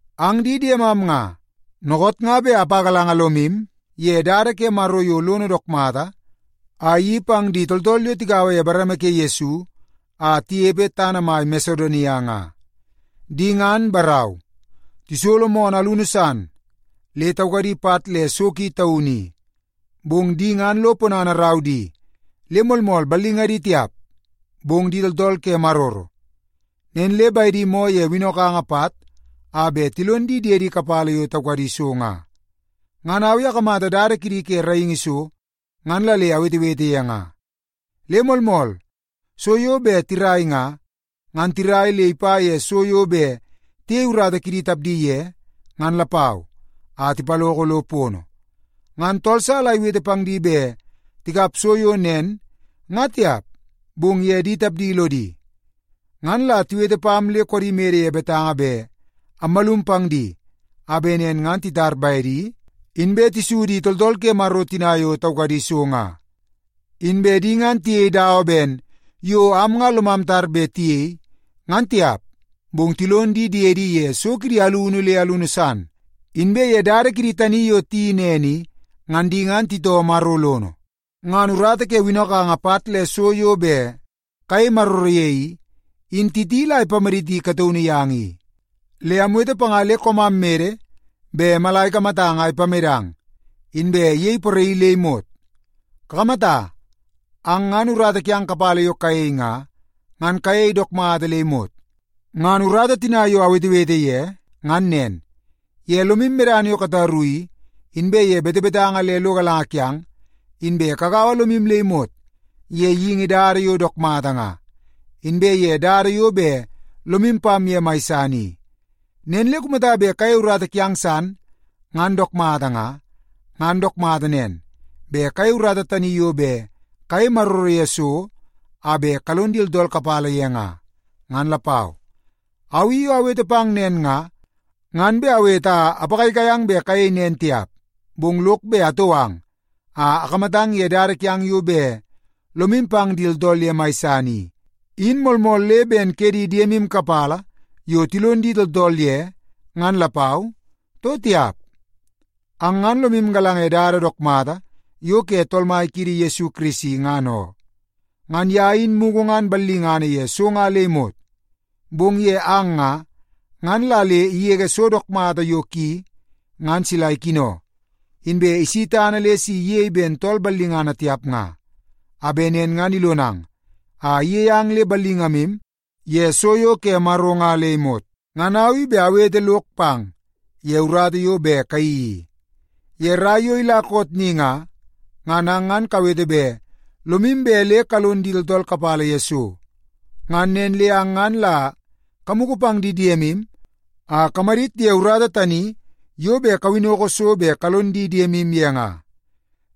Ang di diemam nga, dookoot nga bet apagalanga lomu ye dada ke Maro yo lono dook mata a iyeii pang di tooltool yo tigaua ye bareme ke Yesu a tinepe tana mai Masedonia nga. Di ngan, barau, tisolo moonoo alunu san le taukadi pat le so ki taunu i. Bong di ngan lo ponana irau di le moolmool ballingadi tiap, bong di tooltool ke maroro, nen le bedi moo ye winnokanga pat a bet tilon di diedi kapala yo taukadi so nga. Ngan au i akamata dada kidi ke raingi so, ngan la le awetewete ye nga. Le moolmool, so yo bet tirai nga, ngan tirai le ipa ye so yo bet tiyei urata kidi tapdi ye, ngan lapau, a tipaloko lo pono. Ngan tool sa la iwete pang di bet tikap so yo nen nga tiap, bong ye di tapdi lodi. Ngan la tiwete pam le koodi mede ye betanga bet ammalum pang di, a bet nen ngan titar bedi, inbe tisu di tooltool ke Maro tina yo taukadi so nga. Inbe di ngan tiyei dawa ben yo am nga lomam tar bet tiyei, ngan tiap, bong tilon di diedi ye so kidi alunu le alunu san. Inbe ye dada kidi tani yo tiyeii nen i, ngan di ngan titoo Maro lono. Ngan urata ke winnokanga pat le so yo bet kayei maroro ye i, in Titi la ipamaditi kataunu yang i. Le amwete panga le koomam mede bet mala ikamatang a ipamedang, inbe iyei poraii le imot. Kakamata, ang ngan urata kiang kapala yo kayei nga, ngan kayei dook mata le imot. Ngan urata tina yo awetewete ye ngan nen; ye lomu medana yo kataru i, inbe ye betebetanga le lo galanga kiang, inbe kagaua lomu le imot ye geingi dada yo dook mata nga, inbe ye dada yo bet lomu pam ye mai san i. Nen le kumata bet kayei urata kiang san ngan dook mata nga, ngan dook mata nen, bet kayei urata tani yo bet kayei maroro ye so a bet kalon di tooltool kapala ye nga, ngan lapau. Au i yo awete pang nen nga, ngan bet awete a apagaigai ang bet kayei nen tiap. Bong lok bet atou ang a akamatang ye dada kiang yo bet lomu pang di tooltool ye mai san i, in moolmool le ben ke di diemu kapala yo tilon di tooltool ye ngan lapau, too tiap. Ang ngan lomu galanga ye dada dook mata yo ke Tool Mai kiidi Yesu Kirisi, ngan oo. Ngan ye in mugu ngan ballingana ye so nga le imot, bong ye ang nga, ngan la le igege so dook mata yo ki ngan sila ikino, inbe isi tana le si iyei ben tool ballingana tiap nga, a bet nen ngan ilonang a iyei ang le ballingamu ye so yo ke Maro nga le imot. Ngan au i bet awete lok pang ye urata yo bet kayeii i. Ye rai yo ila koot ni nga, ngan ang ngan kawete bet lomu bet le kalon di tooltool kapala ye so, ngan nen le ang ngan la kamugu pang di diemu a kamadit ye urata tani yo bet kawinnoko so bet kalon di diemu ye nga.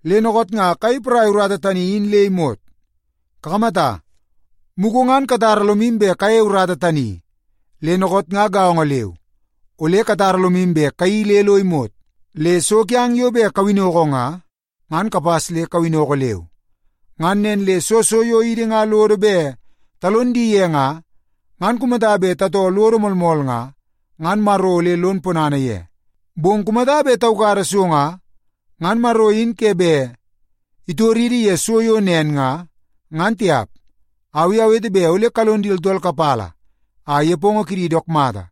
Le dookoot nga kayei poraia urata tani in le imot. Kakamata, mugu ngan katara lomu bet kayeie urata tani, le dookoot nga gaongo leu, ole katara lomu bet kayeii le lo imot. Le so kiang yo bet kawinnoko nga, ngan kapas le kawinnoko leu. Ngan nen le soo so yo idi nga lodo bet talon di ye nga, ngan kumata bet tatoo lodo moolmool nga, ngan Maro ole lon ponana ye. Bong kumata bet taukada so nga, ngan Maro in ke bet itoridi ye so yo nen nga, ngan tiap. Au i awete bet ole kalon di tooltool kapala a nepongo kidi dook mata,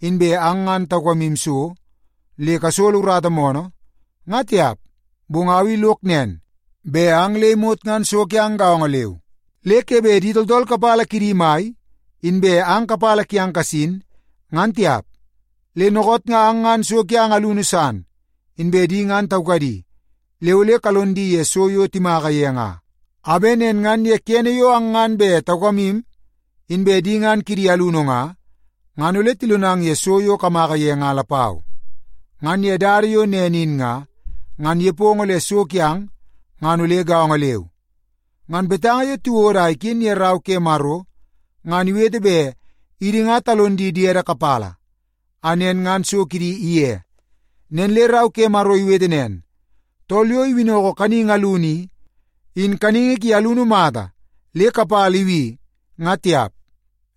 inbe ang ngan taukamu so le kasolo urata moonoo, nga tiap. Bong au i lok nen, bet ang le imot ngan so kiang gaongo leu, le ke bet di tooltool kapala kidi mai, inbe ang kapala kiang kasin, ngan tiap. Le dookoot nga ang ngan so kiang alunu san, inbe di ngan taukadi, le ole kalon di ye so yo timaka ye nga, a bet nen ngan ye kene yo ang ngan bet taukamu, inbe di ngan kidi alunu nga, ngan ole tilonang ye so yo kamaka ye nga lapau. Ngan ye dada yo nen in nga, ngan nepongo le so kiang ngan ole gaongo leu. Ngan betanga yo tiwodo a iken ye Rau ke Maro ngan iwete bet idi nga talon di diede kapala a nen ngan so kidi ige. Nen le Rau ke Maro iwete nen, “Tool yo iwinnoko kaningi alunu i, in kaningi ki alunu mata le kapala ibi, nga tiap.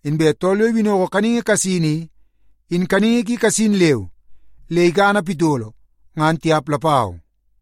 Inbe tool yo iwinnoko kaningi kasin i, in kaningi ki kasin leu le ikana pitolo, ngan tiap lapau.”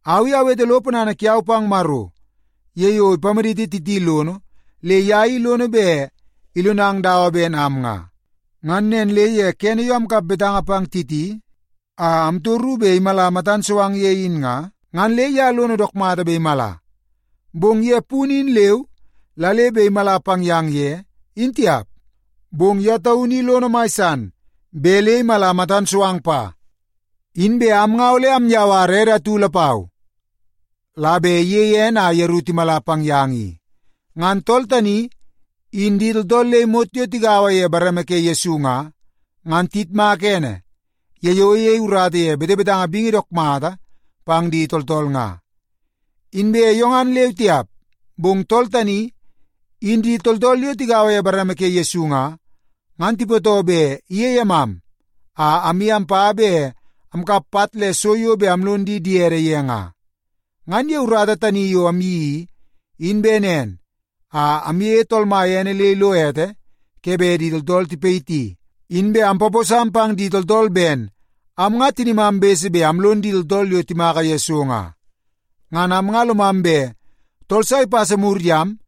Au i awete lo ponana kiau pang Maro ye yo ipamaditi Titi lono le ye i lono bet ilonang dawa ben am nga. Ngan nen le ye kene yo amkap betanga pang Titi a amtoru bet imala matan so ang ye in nga, ngan le ye lono dook mata bet imala. Bong ye punu in leu la le bet imala pang yang ye, in tiap, bong ye taunu i lono mai san bet le imala matan so ang pa. Inbe am nga ole amyawara ede atu lapau la bet iyei ene a yeru timala pang yang i. Ngan tool tani, in di tooltool le imot yo tigaua ye bareme ke Yesu nga, ngan tiyitmaka ene ye yo iyei urata ye betebetanga bingi dook mata pang di tooltool nga. Inbe yo ngan leu tiap, bong tool tani, in di tooltool yo tigaua ye bareme ke Yesu nga, ngan tipootoo bet iyei emam a amye ampa bet amkap pat le so yo bet amlon di diede ye nga. Ngan ye urata tani yo amyeii i, in bet nen a amyeie Tool Mai ene le ilo ete ke bet di tooltool tipayiti, inbe ampaposam pang di tooltool ben am nga tinimam bese bet amlon di tooltool yo timaka ye so nga. Ngan am nga lomam bet tool sa ipasa mur yam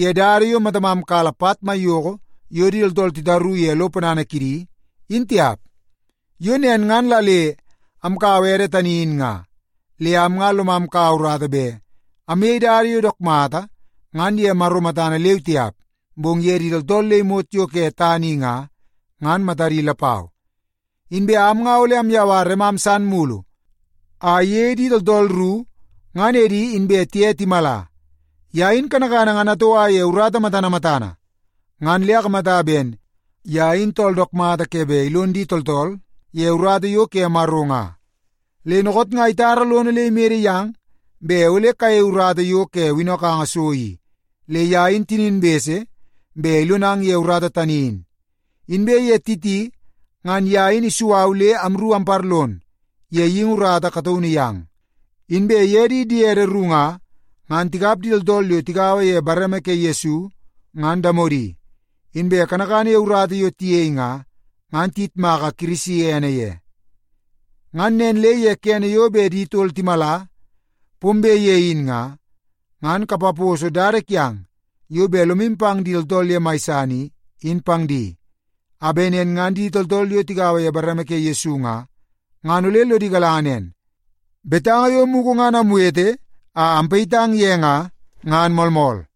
ye dada yo matamam kala pat maiyoko yo di tooltool titaru ye lo ponana kidi, in tiap. Yo nen ngan la le amkaua ede tani in nga. Le am nga lomam kaua urata bet amyei dada yo dook mata ngan ye Maro matana leu tiap, bong ye di tooltool le imot yo ke tana i nga, ngan matadi lapau. Inbe am nga ole amyawara emam san mulu a iyei di tooltool ru ngan edi inbe tiye timala. Ye in kanakana ngan atoua ye urata matana matana, ngan le akamata ben ye in tool dook mata ke bet ilon di tooltool ye urata yo ke Maro nga. Le dookoot nga itara lono le imede yang bet ole kayei urata yo ke winnokanga so i, le ye in tinin bese bet ilonang ye urata tani in. Inbe ye Titi, ngan ye in isu au le amru amparlon ye geingi urata kataunu yang. Inbe ye di diede ru nga, ngan tikap di tooltool yo tigaua ye bareme ke Yesu ngan damodi, inbe kanakana ye urata yo tiyei nga, ngan tiyitmaka Kirisi ene ye. Ngan nen le ye kene yo bet di tol timala pombe ye in nga, ngan kapaposo dada kiang yo bet lomu pang di tooltool ye mai san i, in pang di, a bet nen ngan di tooltool yo tigaua ye bareme ke Yesu nga, ngan ole lodi galanga nen, betanga yo mugu ngan amwete a ampayitang ye nga, ngan moolmool.